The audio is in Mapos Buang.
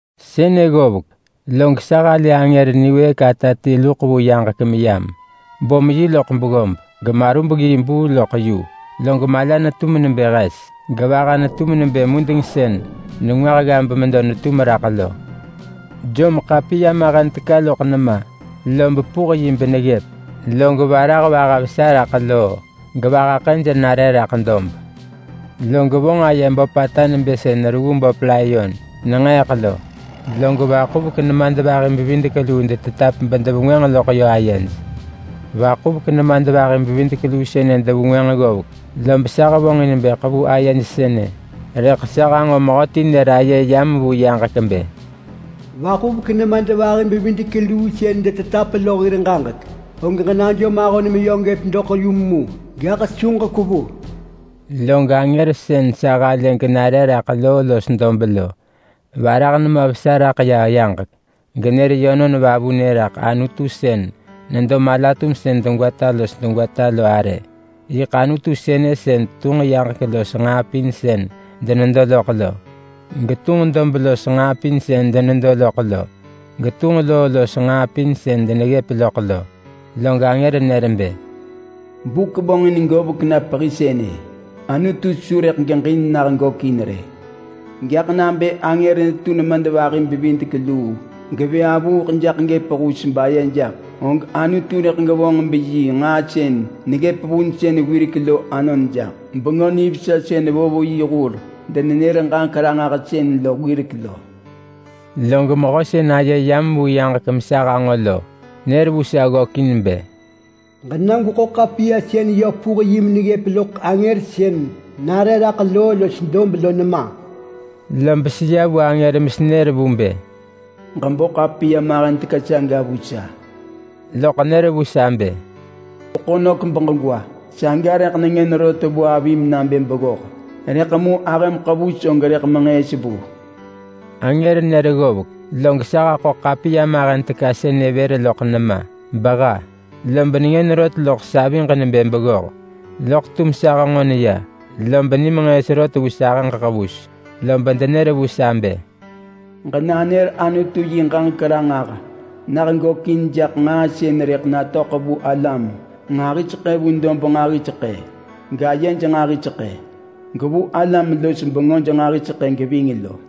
Sënë ggovek, log sa halë angër niwëëk ata ti luḳ vu yaġek meyam. Bom yi loḳ beggob, gemarubggii buu loḳ yu. Log mala netum nebë hes, gevaha netum nebë mudeng sën nengwah gga bemedo netum raḳ lo. Jom ḳapiya mahen teka loḳ nema, lob puh yi beneggëp. Log varah vaha vesa raḳ loo gevaha ḳëj nare raḳ dob. Log vonġ aye böpata nebë sën reggu böp layon nenġeeḳ lo, log vaḳuvek nemadvahi-bevidek-luu detetap bedevengwënġ loḳ yö ayej. Vaḳuvek nemadvahi-bevidek-luu sënë devengwënġ ggovek, lob sa hevonġin bë ḳevu ayej sënë. Rëḳ sa hanġo mehöti nër aye yam vu yaġek bë, “Vaḳuvek nemadvahi-bevidek-luu sën detetap lo hir ġaġek, og ġenajom ahon meyö gëp doḳ yum mu, gaḳ su ġekwevu!” Log angër sën sa halë genare raḳ loo los dob lo, varah nema vesa raḳ ya yaġek, genër yönon vavunë raḳ Anutu sën nedo mala-tumsën degwata los degwata lo arë. Yiḳ Anutu sënë sën tunġ yaġek los nġaa pin sën denedo loḳ lo, getunġ dob los nġaa pin sën denedo loḳ lo, getunġ loo los nġaa pin sën deneggëp loḳ lo. Log angër nër bë, “Buk vonġin govek na pehi sënë. Anutu su rëḳ geġin nah gökin rë. Gaḳ nabë angër netu nemadvahi-bevidek-luu gevë avuuḳ jaḳ gëp hus baye jaḳ, og Anutu rëḳ gevonġ beyi nġaa sën neggëp vunsën wirek lo anon jaḳ. Nabë sën nër loḳ Bengö Nivesa sën vo vu yi hur-denenër-ġaġek-ranġahsën lo wirek lo.” Log mehö sën aye yam vu yaġek mesa hanġo lo, nër vu sa ggökin bë, “Ġena gweḳo ḳapiya sën yö puh yi meneggëp loḳ angër sën nare raḳ loo los dob lo nema.” Lob seya vu angër mesenër vu bë, “Ġebo ḳapiya mahen teka saga vu sa.” Loḳ nër vu sa bë, “Gweḳo nök beġegwa. Saga rëḳ nengën rot vu avim nabë beggoh. Rëḳ mu ahëm ḳevus og rëḳ menġëës vu.” Angër nër ggovek, log sa haḳo ḳapiya mahen teka sënë vër loḳ nema beha. Lob nengën rot loḳ saviġ nebë beggoh. Loḳ tum sa henġon ya, lob nimenġëës rot vu sahëġ ḳevus. Lob denër vu sa bë, “Ġenanër Anutu yi ġaġek ranġah nah gökin jaḳ nġaa sën rëḳ natöḳ vu alam nġahiseḳë vu dob nġahiseḳë, gayej nġahiseḳë, gevu alam-los-bengöj nġahiseḳë geving lo.”